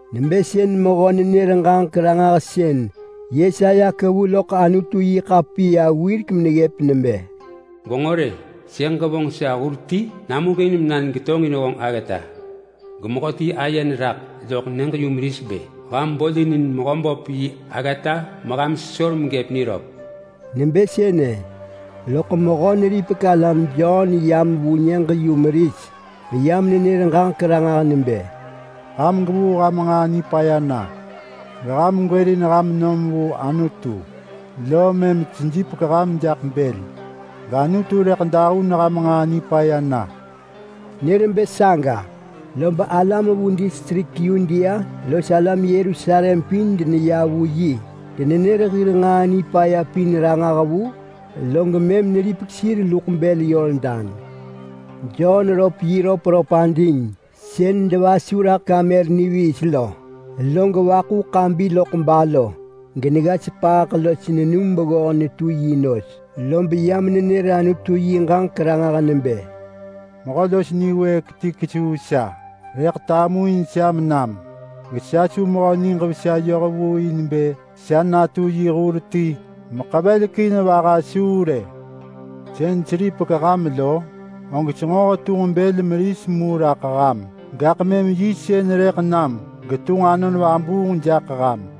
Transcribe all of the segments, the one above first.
Nebë sën mehö-nenër-ġaġek-ranġahsën Yesaya kevu loḳ Anutu-yi-ḳapiya wirek meneggëp nebë: “Gwenġo rë! Sëḳ ġevonġ sa hur ti namuġin mena negetonġin honġ aggata.” “Gemehöti aye neraḳ loḳ nyëġ-yumeris bë, ‘Ham bolinin Mehöböp yi aggata meham sesor megëp niröp.’” Nebë sënë, loḳ Mehö-neripek-alam Jon yam vu nyëġ-yumeris meyam nenër ġaġek ranġah nebë, “Ham gwevuu ham nġaa nipaya na, geham gwërin ham nom vu Anutu, lom mëm sejipek ham jaḳ bël, gAnutu rëḳ dahun ham nġaa nipaya na.” Nër bë saga, lob alam vu distrik Yudea los alam Yerusalem pin deneya vu yi. Denenër hir nġaa nipaya pin ranġah vu, log mëm neripek sir luḳ bël Yordan. Jon röp yi röpröp ading sën denevasu raḳ kamer niviis lo, log nevëh ḳabi neggëp balo, genegga sepaaḳ los nenum beggoh netu yi nos. Lob yam nenër Anutu yi ġaġek ranġah nebë, “Mehö los niwëëk ti kesuu sa rëḳ tamuin sa menam. Gesa su mehö niġ vesa yoh vu in bë sa natu yi hur ti meḳevelekin vaha suu rë. Sën seripek ham lo, og senġo hetunġ bël meris mu raḳ ham, gaḳ mëm yi sën rëḳ nam getunġ Anon Vabuung jaḳ ham.”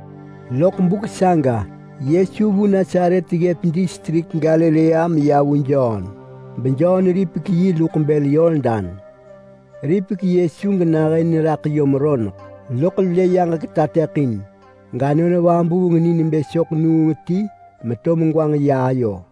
Vu buk saga Yesu vu Nasaret ggëp distrik Galilea meya vu Jon, beJon ripek yi luḳ bël Yordan. Ripek, log Yesu nahën neraḳ yom roneḳ, loḳ lë geyaġek tateḳin ya gAnon Vabuung ni nebë soḳ nuung ti meto megwanġ ya Yesu ayo.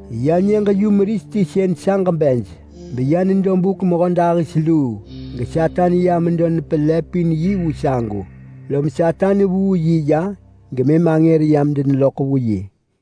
Ya nyëġ-yumeris ti sën saġ hir nyëġ lo beya nedo buk mehödahis luu, geSatan ya medo nepelëpin yi vu sagu. Lom Satan vuu yi ya gemëm angër yam deneloḳ vu yi.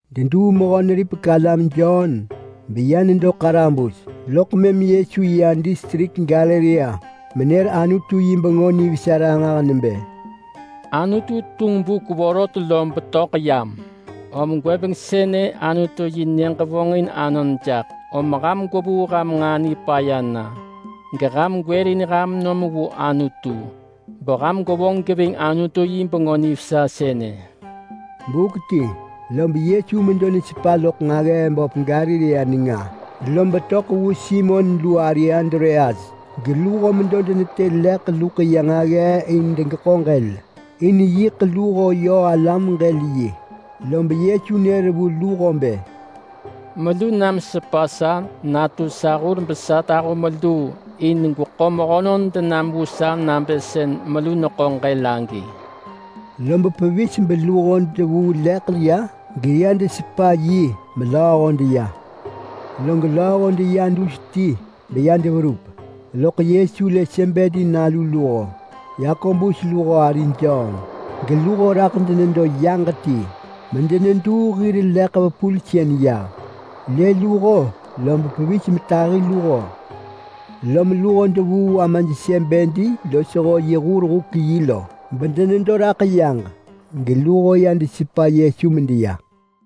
Deduu Mehö-neripek-alam Jon beya nedo ḳarabus, loḳ mëm Yesu ya distrik Galilea menër Anutu yi Bengö Nivesa ranġah nebë, “Anutu tunġ buk vorot lob töḳ yam, om gwëbeng sënë Anutu-yi-nyëġ vonġin anon jaḳ, om ham gwevuu ham nġaa nipaya na, geham gwërin ham nom vu Anutu, beham gwevonġ geving Anutu yi Bengö Nivesa sënë.” Buk ti lob Yesu medo nesepa loḳ nġaggee böp Galilea nenga, lob töḳ vu Simon lu ari Andreas geluho medo denetë leḳ luḳ ya nġaggee in bë degeḳo ġël, in yiḳ luho yö hir huk sagi. Lob Yesu nër vu luho bë, “Melu nam sepa sa natu sa hur besa tahu meluu in gweḳo mehönon denam vu sa nabë sën melu neḳo ġël gwëbeng agi lo.” Lob pevis beluho devuu leḳ ya geya desepa yi melööho deya. Log lööho deya dus ti beya deverup, loḳ Yesu lë Sebedi nalu luho, Yakobus lu ari Jon, geluho raḳ denedo yaġ ti medeneduu hir leḳ vepulsën yah. Lë luho lob pevis metahi luho. Lom luho devuu amaj Sebedi losho yi hur-huk-yi lo beraḳ denedo yaġ geluho ya desepa Yesu medeya.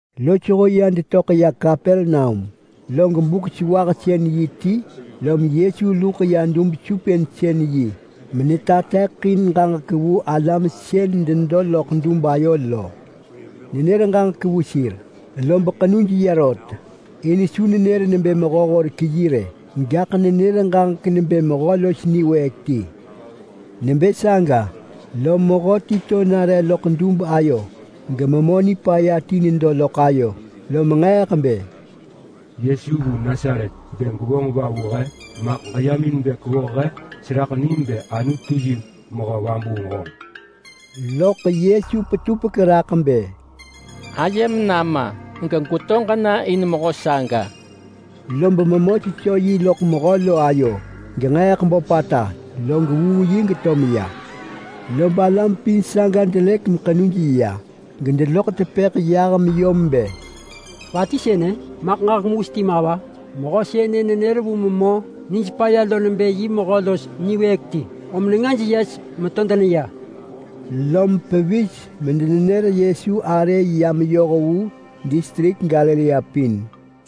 Sir sënë ya detöḳ ya Kapernaum, log yiḳ Yudea hir Buk-sewahsën-yi ti, lom Yesu luḳ ya dub-supinsën-yi menetateḳin ġaġek vu alam sën denedo loḳ lo. Nenër ġaġek vu sir, lob ḳenuj ya rot in su nenër nebë mehö-horek-yi rë, gaḳ nenër ġaġek nebë mehö los niwëëk ti. Nebë saga, lom mehöti to nare loḳ dub ayo gememö nipaya ti nedo loḳ ayo. Lom nġeeḳ bë, “Yesu vu Nasaret! Bë gwevonġ va vu he? Maḳ ġeyam in bë kwevoh he? Seraḳ nim nebë Anutu yi Mehö Vabuung honġ!” Loḳ Yesu petupek raḳ bë, “Ayem nama! Ġegweto ġena in mehö saga!” Lob memö sesö yi loḳ mehö lo ayo genġeeḳ böpata, log vuu yi geto meya. Lob alam pin saga delëk anon, gedeneloḳ tepëḳ vu sir bë, “Va ti sënë? Maḳ ġaġek mewis ma va? Mehö sënë nenër vu memö nijpaya lo ving nebë yi mehö los niwëëk ti, om nengaj yes geto deneya!” Lom pevis medenenër Yesu arë ya meyoh vu distrik Galilea pin.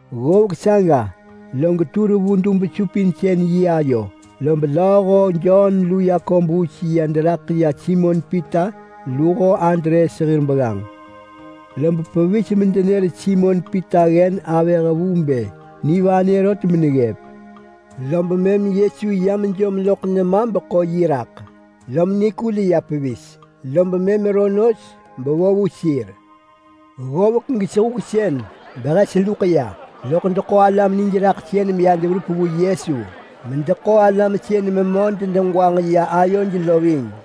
Ggovek saga log tur vu dub-supinsën-yi ayo, lob lööho Jon lu Yakobus ya deraḳ ya Simon Pita luho Andreas hir begganġ. Lob pevis medenër Simon Pita ggen avëh vu bë nivanë rot meneggëp. Lob mëm Yesu ya mejom loḳ nema beḳo yi raḳ, lom nikul ya pevis, lob mëm neyeh nos bevo vu sir. Ggovek log sehuksën behes luḳ ya, lob deneḳo alam nijraḳsën meya deverup vu Yesu, medeneḳo alam sën memö denegwanġ ya ayoj ving.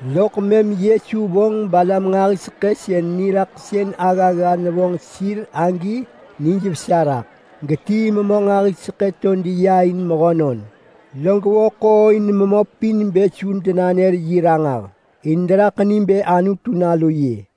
Loḳ mëm Yesu nevonġ alam nġahiseḳë sën niraḳsën aggagga nevonġ sir agi benijvesa neraḳ, genetii memö nġahiseḳë to deneya in mehönon. Log nërin memö pin bë su denanër yi ranġah, in deneraḳ ni bë Anutu Nalu yi.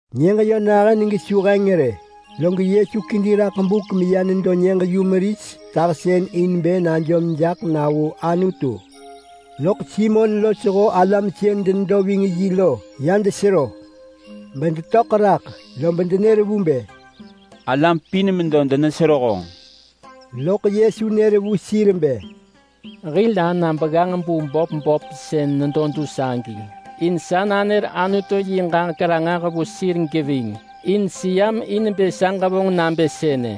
Nyëġ yö nahën gesu heng rë, log Yesu kedi raḳ buk meya nedo nyëġ-yumeris tahsën in bë najom jaḳ na vu Anutu. Loḳ Simon losho alam sën denedo ving yi lo ya desero bedetöḳ raḳ lob denër vu bë, “Alam pin medo denesero honġ!” Loḳ Yesu nër vu sir bë, “Hil ana begganġ bu böp böp sën nedo dus agi in sa nanër Anutu yi ġaġek ranġah vu sir geving. In seyam in bë sa ġevonġ nabë sënë.”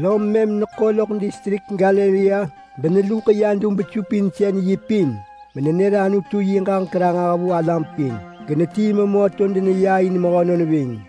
Lom mëm neḳo loḳ distrik Galilea beneluḳ ya dub-supinsën-yi pin menenër Anutu yi ġaġek ranġah vu alam pin. Genetii memö to deneya in mehönon ving.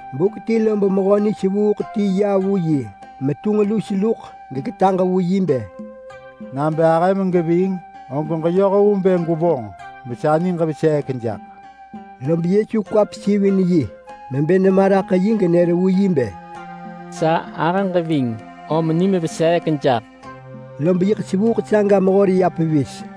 Buk ti lob mehöti los nisevuuḳ ya vu yi metunġ lus luḳ geketaġ vu yi bë, “Nabë ahëm geving, og ġeyoh vu bë gwevonġ besa niġ veseek jaḳ.” Lob Yesu kwa pesivin yi mebë nema raḳ yi genër vu yi bë, “Sa ahëġ ving! Om nim veseek jaḳ!” Lob yiḳ sevuuḳ saga mehor ya pevis.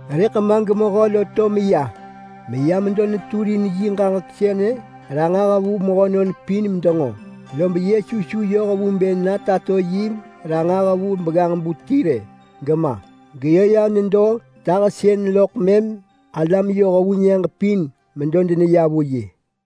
Rëḳ ma gemehö lo to meya meya medo neturin yi ġaġek sënë ranġah vu mehönon pin medenġo, lob Yesu su yoh vu bë na tato yi ranġah vu begganġ-bu ti rë gema. Geyö ya nedo tahsën loḳ mëm alam yoh vu nyëġ pin medo deneya vu yi.